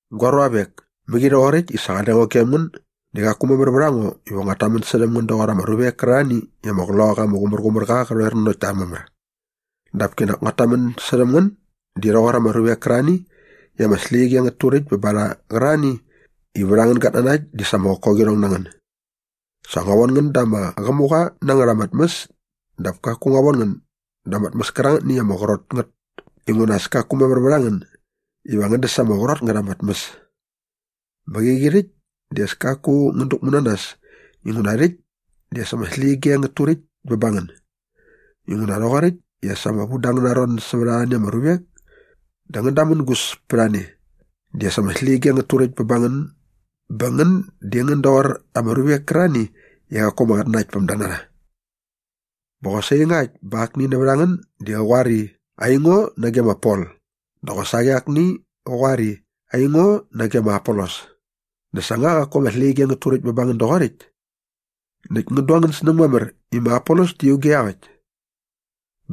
Gua ruavek, mäqi rhoqoräkt i sa qale ngo gem ngän di qaku mamär vät a ngo iva nguat tamän särhäm ngän doqor ama ruvek kärarhani i ama Qloqaqa ama Qumärqumärqa qä rhoer nanokt ta mamär. Dap kinak nguat tamän särhäm ngän di rhoqor ama ruvek kärarhani i ama släqyige ngät turäkt bä ba rha qärarhani i vät angän gatnanakt di as ama qokoqirhong na ngän. Sa ngua von ngän da ama qämuqa na ngät ama tmäs dap kaku ngua von ngän da ama tmäs kärangätni i ama qrot ngät inguna as kaku mamär vät a ngän iva ngän däs ama qrot ngät ama tmäs. Bä qäqi rhäkt di as kaku ngän däkmu na nas inguna rhäkt di as ama släqyige ngät turäkt bä ba ngän. Inguna rhoqoräkt i as ama vu da angäna ron sävät arhani ama ruvek dä ngän damängus pät a ne di as ama släqyige ngät turäkt bä ba ngän bä ngän di ngän dualat toqor ama ruvek kärarhani i qaku ama qatnanaktpämda na rha. Bä qosaqi ngakt bä akni nävät a ngän di qä qoar i, “Aingo nage ma Pol” dä qosaqi akni qä qoar i, “Aingo nage ma Apolos” dä sa nga qaku ama släqyige ngät turäkt bä ba ngän doqoräkt? Näkt ngän du angän snäng mamär i ma Apolos di auge iaqäkt.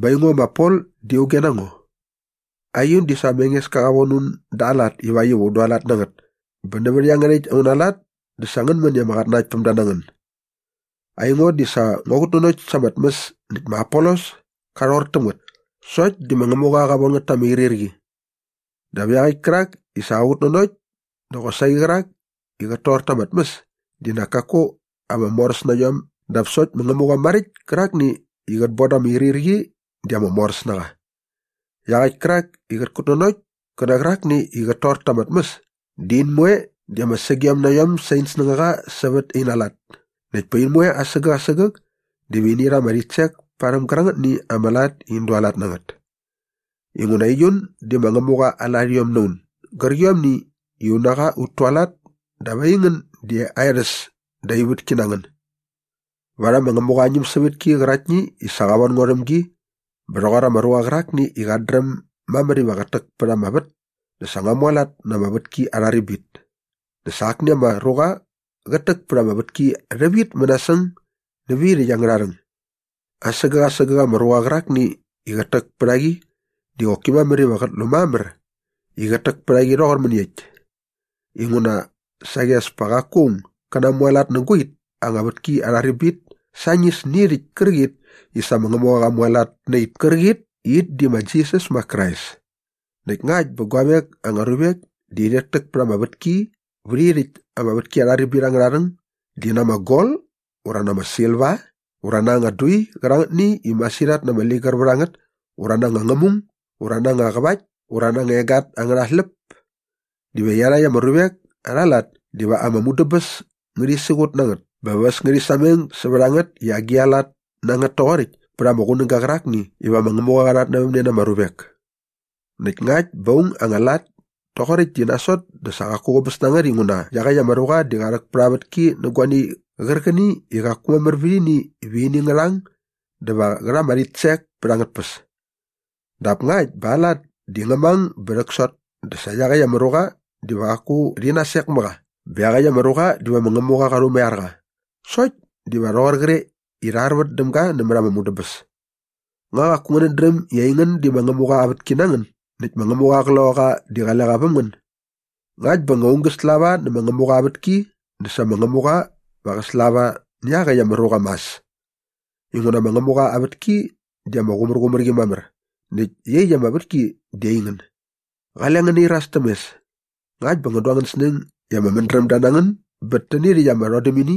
Bä aingo ma Pol di auge na ngo? Aiun di sa ma Engeska qa von un da aa lat ivakt iva un dualat na ngät bä nävät iangärhäkt auna lat dä sa ngän män i ama qatnanaktpämda na ngän. Aingo di sa ngua qutnanokt ama tmäs näkt ma Apolos ka rhor täm ngät sokt di ma Ngämuqa qa von ngät ta ama irhirqi. Dap iaqäkt kärak i sa qät kutnanokt dä qosaqi qärak i qät tor ta ama tmäs di nak kaku ama moräs na iom dap sokt ma Ngämuqa maräkt kärakni i qät bon da ama irhirqi di ama moräs na qa. Iaqäkt kärak i qät kutnanokt kä nä qärakni i qät tor ta ama tmäs di in moe di ama sägiom na iom sä in snängaqa sävät ina lat näkt pa in moe asägäk asägäk diva ini rha ama rhitsek parhäm gärangätni ama lat i in dualat na ngät. Inguna aiun di ma Ngämuqa aa larhiom na un gärqiomni i un na qa ut tualat dap aingän di aa erhäs dä aa vätki na ngän. Varhäm ma Ngämuqa aa ñämsävätki qäraktni i sa qa von ngo rhäm gi bä rhoqor ama ruqa qärakni i qat dräm mamär iva qät täk pät ama vät dä sa ngua mualat na ama vätki arha ribit näkt sa akni ama ruqa qät täk pät ama vätki rhävit mänasäng nävä it angärha rhäng. Asägäk asägäk ama ruqa qärakni i qät täk pät a qi di qoki mamär iva qät lu mamär i qät täk pät a qi rhoqor mäniekt. Inguna saqi as pa qaku aung gä namualat nä guait anga vätki arha ribit sañis nä irhäkt kärqit i sa ma Ngämuqa qa mualat na it kärqit i it di ma Jisas ma Krais. Näkt ngakt bä guavek anga ruvek di rhit täk pät ama vätki vät irhäkt ama vätki arha ribit angärha rhäng di na anga gol ura na anga silva ura na anga dui qärangätni i masirhat na ama ligär vät a ngät ura na anga ngämung ura na anga qävakt ura na anga egat angärha släp diva iarhakt ama ruvek arha lat diva ama mudäbäs ngärhi siqut na ngät bä va äs ngärhi sameng sävät a ngät i agi a lat na ngät toqoräkt pät ama qunäga qärakni iva ma Ngämuqa qa rhatnävämne na ama ruvek. Näkt ngakt bä aung aa anga lat toqoräkt di nasot dä sa qaku qäbäs na ngät inguna iaqäkt ama ruqa di qa rhäk pät ama vätki nä guani qärqäni i qaku mamär vät ini iva ini ngä rhang dä va qä rha ama rhitsek pät angät tpäs. Dap ngakt bä aa lat di ngä mang bä rhäksot dä sa iaqäkt ama ruqa diva qaku rhi nasek mä qa bä iaqäkt ama ruqa diva ma Ngämuqa qa rhumaiar qa sokt diva rhoqor qre i sa rha arvät däm ga nämät ama mudäbäs. Nga qaku ngänät dräm i aingän di ma Ngämuqa aa vätki na ngän näkt ma Ngämuqa aa Qloqaqa di qale qa väm ngän? Ngakt bä nga aung gä slava nä ma Ngämuqa aa vätki dä sa ma Ngämuqa va qä slava nä iaqäkt ama ruqa mas. Inguna ma Ngämuqa aa vätki di ama qumärqumär qi mamär näkt iaqyäkt ama vätki di aingän. Qale ngän nairas täm mes. Ngakt bä ngän du angän snäng i ama mädrämda na ngän bät täni rhäkt ama rhodämini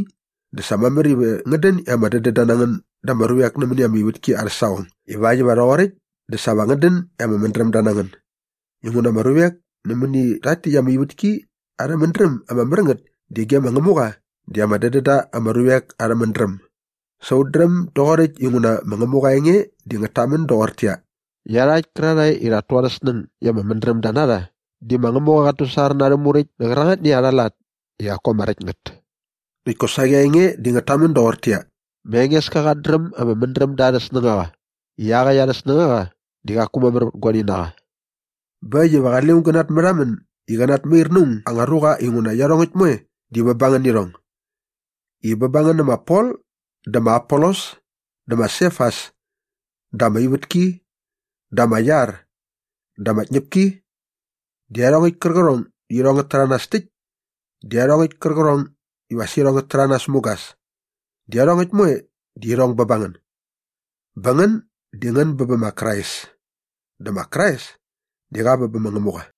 dä sa mamär iva ngän dän i ama dädända na ngän da ama ruvek nämäni ama ivätki arhä saqong ivakt iva rhoqoräkt dä sa va ngän dän i ama mädrämda na ngän. Inguna ama ruvek nämäni rhakt täkt ama ivätki arhä mädräm ama mär ngät di ge ma Ngämuqa di ama dädän da ama ruvek arhä mädräm. Sa ut dräm doqoräkt inguna ma Ngämuqa aa enge di ngät tamän doqortäqyia, “Iarhakt kärarhae i rhat tu arhä snäng i ama mädrämda na rha di ma Ngämuqa qat tusar na arhä muräkt nä qärangätni arha lat i qaku ama räkt ngät.” Näkt kosaqi aa enge di ngät tamän doqortäqyia, “Ma Engeska qat dräm ama mädrämda arhä snängaqa i iaqäkt arhä snängaqa di qaku mamär vät guani na qa.” Bä äkt iva qale aung gä natmärhamän i qä natmair na aung anga ruqa inguna iarhongäkt moe di bä ba ngän nä irhong i bä ba ngän nä ma Pol dä ma Apolos dä ma Sefas dä ama ivätki dä ama iar dä ama tñäpki dä iarhongäkt kärqärhong i irhong ngät täranas täkt dä iarhongäkt kärqärhong iva as irhong ngä rhäranas mugas di iarhongäkt moe di irhong bä ba ngän. Bä ngän di ngän bä bä ma Krais dä ma Krais di qa bä bä ma Ngämuqa.